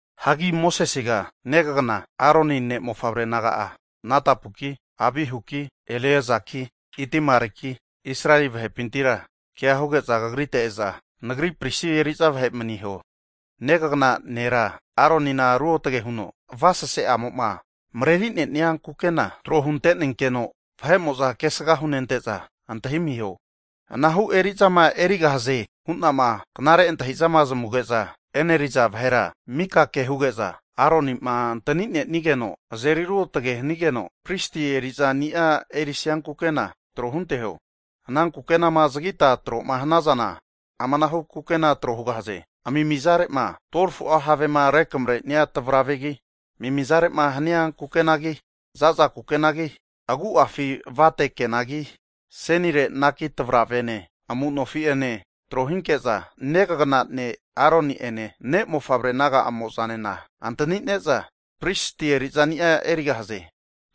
Hagi Mosesega negafu Aronine ne' mofavre naga'a Nadabuki, Abihuki, Eleazaki, Itamaliki, Israeli vahepintira ke huge'za kagrite e'za Nagri pristi eri'za vahe maniho. Negafu nera Aronina ruotage huno avasese'amo'ma mareri'neni'a kukena tro huntenenkeno, vahe'mo'za kesga hunente'za antahimiho. Anahu eri'zama erigahaze hu'nama knare antahi'zama zamuge'za e'neri'za vahera mika ke huge'za, Aroni'ma antani'nenigeno azeri ruotage hanigeno, pristi eri'zani'a erisia kukena'a tro hunteho. Ana kukenama zagita tro'ma hnazana amanahu kukena tro hugahaze, amimizare'ma 12fu'a havema rekamre'nia tavravegi, amimizare'ma hania kukenagi za'za kukenagi, agu'afi avate kenagi, asenire naki tavravene amu'nofi'ene trohinke'za, negafu ne' Aroni'ene ne' mofavre naga'amo'zanena antanine'za, pristi eri'zani'a erigahaze.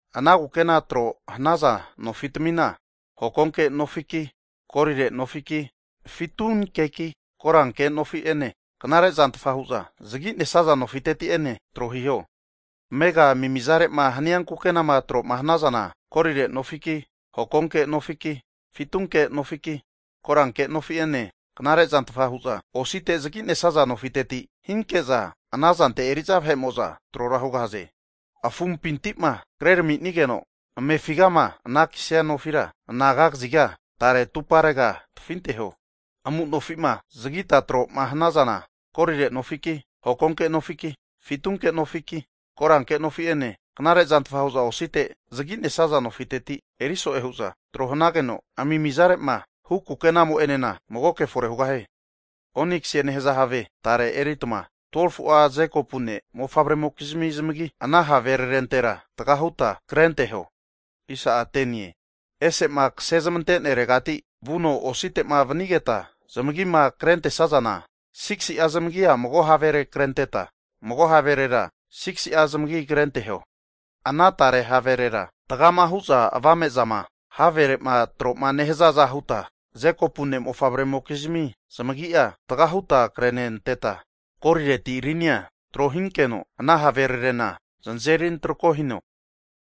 Ana kukenama tro hanaza nofitamina, hokonke nofiki, golire nofiki, fitunkeki, koranke nofi'ene knare zantfa hu'za zagi'nesa nofiteti'ene tro hiho. Amega amimizare'ma hania kukenama tro'ma hanazana, golire nofiki hokonke nofiki, fitunke nofiki, koranke nofi'ene knare zantfa hu'za osite zagi'nesaza nofiteti hinke'za ana zante eri'za vahe'mo'za trora hugahaze. Afumpinti'ma krerami'nigeno amefigama anakisnia nofira anaga kaziga tare atumparega tafinteho. Amu nofi'ma zagita tro'ma hnazana, golire nofiki, hokonke nofiki, fitunke nofiki, koranke nofi'ene knare zantfa hu'za osite zagi'nesa nofiteti eri so'e hu'za tro hanageno, amimizare'ma hu kukenamo'enena magoke fore hugahie. Oniksie nehaza have tare eritma 12fu'a Jekopu ne' mofavre'mokizmi zamagi, ana haverarentera taga huta krenteho. Ese'ma kase zamante'neregati vuno osite'ma vanigeta zamagima krentesazana, 6si'a zamagia mago havere krenteta, mago haverera 6si'a zamagi'a krenteho. Ana tare haverera, tagama hu'za avame'zama havere'ma tro'ma nehazaza huta, Jekopu ne' mofavre'mokizmi zamagi'a taga huta krenenteta, golireti rinia tro hinkeno ana haverarena znazeri antrako hino.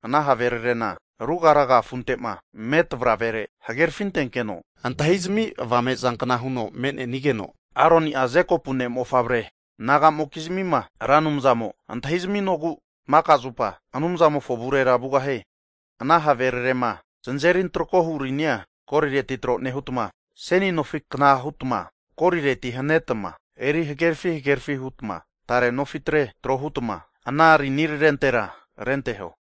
Ana havererena ruga raga afunte'ma me' tavravere hagerafintenkeno antahizami avame zankna huno me'ne'nigeno, Aroni'a Jekopu ne' mofavre naga'mokizmima Ra Anumzamo antahizaminogu maka zupa Anumzamofo avurera vugahie. Ana havererema znazeri antrakohu rinia golireti tro nehutma, seni nofikna hutma golireti hanetma eri hagerafi hagerafi hutma tare nofitre, tro hutma ana rinirarentera renteho.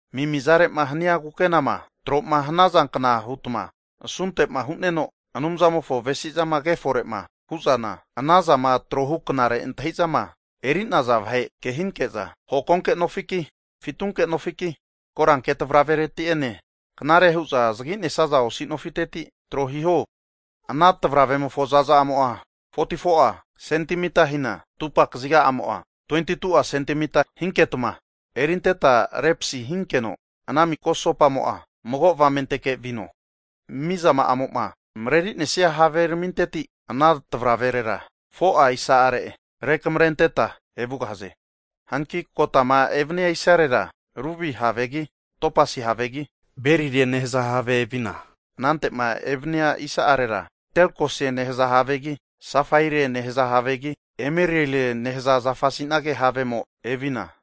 Amimizare'ma hania kukenama tro'ma hanazankna hutma, asunte'ma hu'neno Anumzamofo avesi'zama kefore'ma hu'zana, ana zama trohu knare antahi'zama eri'naza vahe ke hinke'za, hokonke nofiki, fitunke nofiki, koranke tavravereti'ene knare hu'za zagi'nesaza osi nofiteti tro hiho. Ana tavravemofo zaza'amo'a 44'a sentimita hina, atupa kaziga'amo'a 22'a sentimita hinketma erinteta repasi hinkeno, ana maka asopamo'a mago avamenteke vino. Miza zama'amo'ma mareri'nesia have raminteti ana tavraverera 4'a isa'are rekamarenteta evugahaze. Hanki kotama evania isarera rubi havegi, topasi havegi, berilie nehaza have evina, anante'ma evania isa'arera terkoise nehaza havegi, safaire nehaza havegi, emererie nehaza zafasi'nage havemo evina,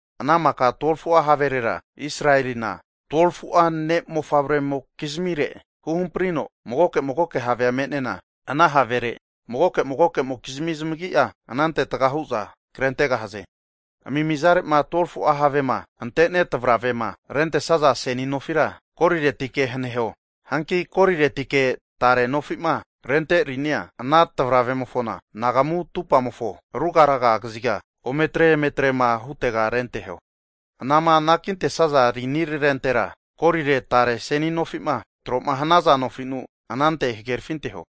Ana maka 12fu'a haverera Israelina (Jekopu) 12f'u'a ne' mofavre'mokizmire huhamprino magoke magoke have'a me'nena, ana havere mago magomokizmi zamagi'a anante taga hu'za krentegahaze. Amimizare'ma 12fu'a havema ante'ne tavravema rentesaza seni nofira goliretike haneho. Hanki goliretike tare nofi'ma rente rinia ana tavravemofona anagamu atumpamofo ruga raga kaziga ometre emetrema hutega renteho. Anama anakintesaza rinirarentera golire tare seni nofi'ma tro'ma hanaza nofinu anante hagerafinteho.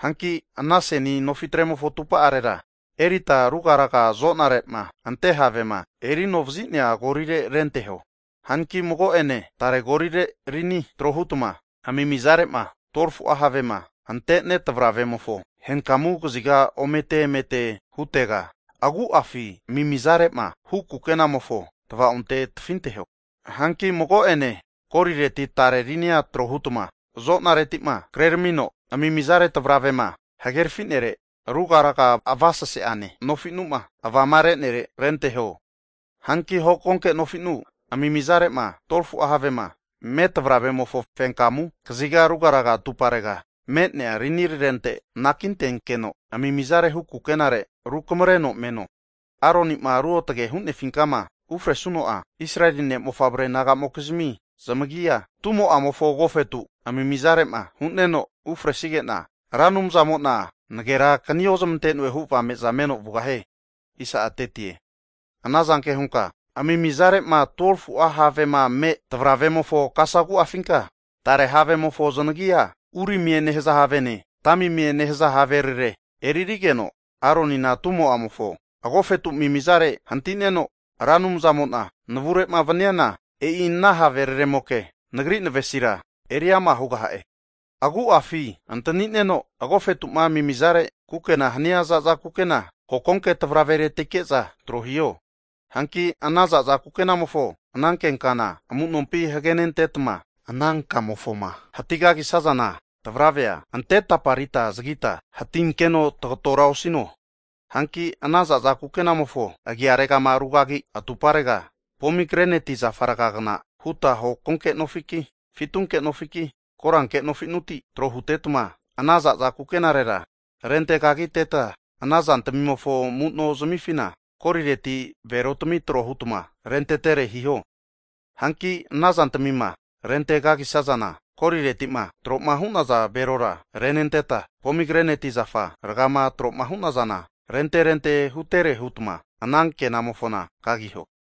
Hanki ana seni nofitremofo atupa'arera erita rugaraga azonare'ma ante havema eri anovazi'nea golire renteho. Hanki mago ene tare golire rini tro hutma amimizare'ma 12fu'a havema ante'ne tavravemofo henkamu kaziga omete emete hutega, agu'afi amimizare'ma hu kukenamofo tvaonte tafinteho. Hanki mago'ene golireti tare rinia tro hutma azonareti'ma kreramino amimizare tavravema hagerafi'nere ruga raga avasase'ane nofi'numa avamare'nere renteho. Hanki hokonke nofi'nu amimizare'ma 12f'u'a havema me' tavravemofo fenkamu kaziga rugaraga atumparega me'nea rinirarente anakintenkeno, amimizare hu kukenare rukamreno meno. Aroni'ma Ruotage'ma hu'nefinkama ufresuno'a Israeli ne' mofavre naga'mokizmi zamagia tumo'amofo agofetu amimizare'ma hu'neno ufresige'na, Ra Anumzamo'na nagerakni ozamante'noe hu avame'za meno vugahie. Ana zanke hunka amimizare'ma 12fu'a havema me' tavravemofo kasagu'afinka, tare havemofo zanagi'a urimie nehaza havene, tamimie nehaza haverare eririgeno Aronina tumo'amofo agofetu amimizare hanti'neno, Ra Anumzamo'na navure'ma vaniana, e'i ana haveraremoke Nagri navesira eri ama' hugaha'e. Agu'afi antani'neno agofetu'ma amimizare kukena hania za'za kukena, hokonke tavraveretike'za tro hiho. Hanki ana za'za kukenamofo ananke kana amu'nompi hagenentetma, ana kamofoma hatigagisazana tavravea ante taparita zagita hatinkeno tagatora osino. Hanki ana za'za kukenamofo agiaregama rugagi atumparega, pomigreneti zafa rgagna huta hokonke nofiki, fitunke nofiki koranke nofi'nuti tro hutetma ana za'za kukenarera rentekagiteta, ana zantamimofo amu'no zmifina golireti belotami tro huta renterente hiho. Hanki ana zantamima rente kagisazana, golireti'ma tro'ma hu'naza belora renenteta, pomigreneti zafa rgama tro'ma hu'nazana rente rente hutere hutma, ana kenamofona kagiho.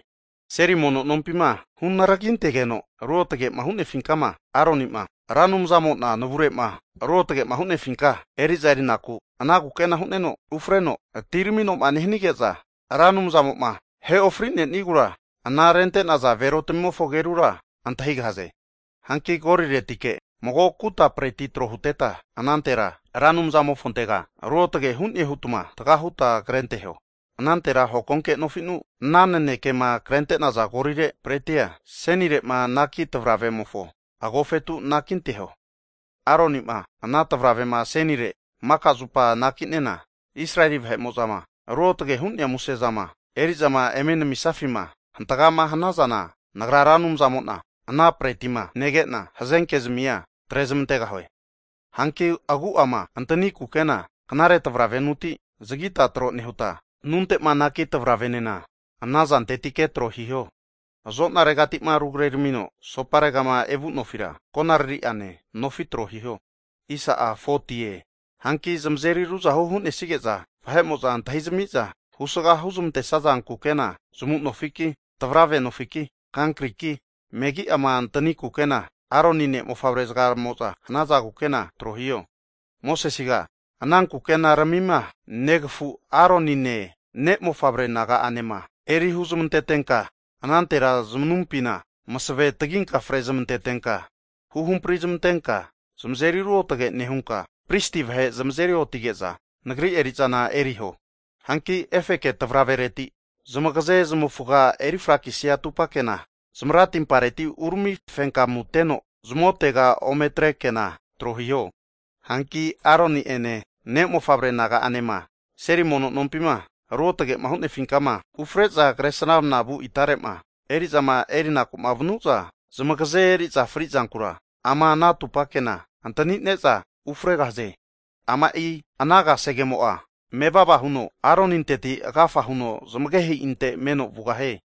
Seli mono nompima hunaragintegeno ruotage'ma hu'nefinkama Aroni'ma, Ra Anumzamo'na navure'ma ruotagema hu'nefinka eri'za eri'naku ana kukena hu'neno ufreno atiramino'ma nehanige'za, Ra Anumzamo'ma ahe ofri'nenigura ana arente'naza belotamimofo agerura antahigahaze. Hanki goliretike mago kuta preti tro huteta anantera Ra Anumzamofontega ruotage hu'ne hutma taga huta krenteho. Anantera hokonke nofi'nu ana nanekema krente'naza gorile pretia asenire'ma anaki tavravemofo agofetu anakinteho. Aroni'ma ana tavravema asenire maka zupa anaki'nena, Israeli vahe'mo'zama ruotage hu'nea musezama eri'zama eme namisafima hantagama hanazana, Nagra Ra Anumzamo'na ana pretima nege'na hazenkezmia atre zmantegahue. Hanki agu'ama antani kukena knare tavravenuti zagita tro nehuta, anunte'ma anaki tavravenena ana zantetike tro hiho. Azonaregati'ma rugreramino asoparegama evu nofira konaririane nofi tro hiho. Hanki zamazeri ruzahu'ma hu'nesige'za vahe'mo'za antahizami'za husga huzmantesaza kukena zamu'nofi ki tavrave nofiki, kankriki megi'ama antani kukena (tunik) Aroni ne' mofavre zagamo'za hanaza kukena tro hiho. Mosesega ana kukenaramima negafu Aronine ne' mofavre naga'anema eri huzamantetenka, anantera zmanumpina masave taginka fre zmentetenka, huhamprizmantenka zamazeri ruotage nehunka, pristi vahe zamazeri otige'za Nagri eri'zana eriho. Hanki efeke tavravereti zamagaze zmavufga eri frakisia atupa kena, zmaratimpareti urami fenkamuteno zamotega ome atre kena tro hiho. Hanki Aroni'ene ne' mofavre naga'anema seli mono nompima ruotage'ma hu'nefinkama ufre'za Kresramanavu itare'ma eri'zama erinaku'ma vanu'za, zamagaze eri'za frizankura ama ana atupa kena antanine'za ufregahaze. Ama'i ana kasegemo'a mevava huno Aroninteti agafa huno zmagehe'inte meno vugahie.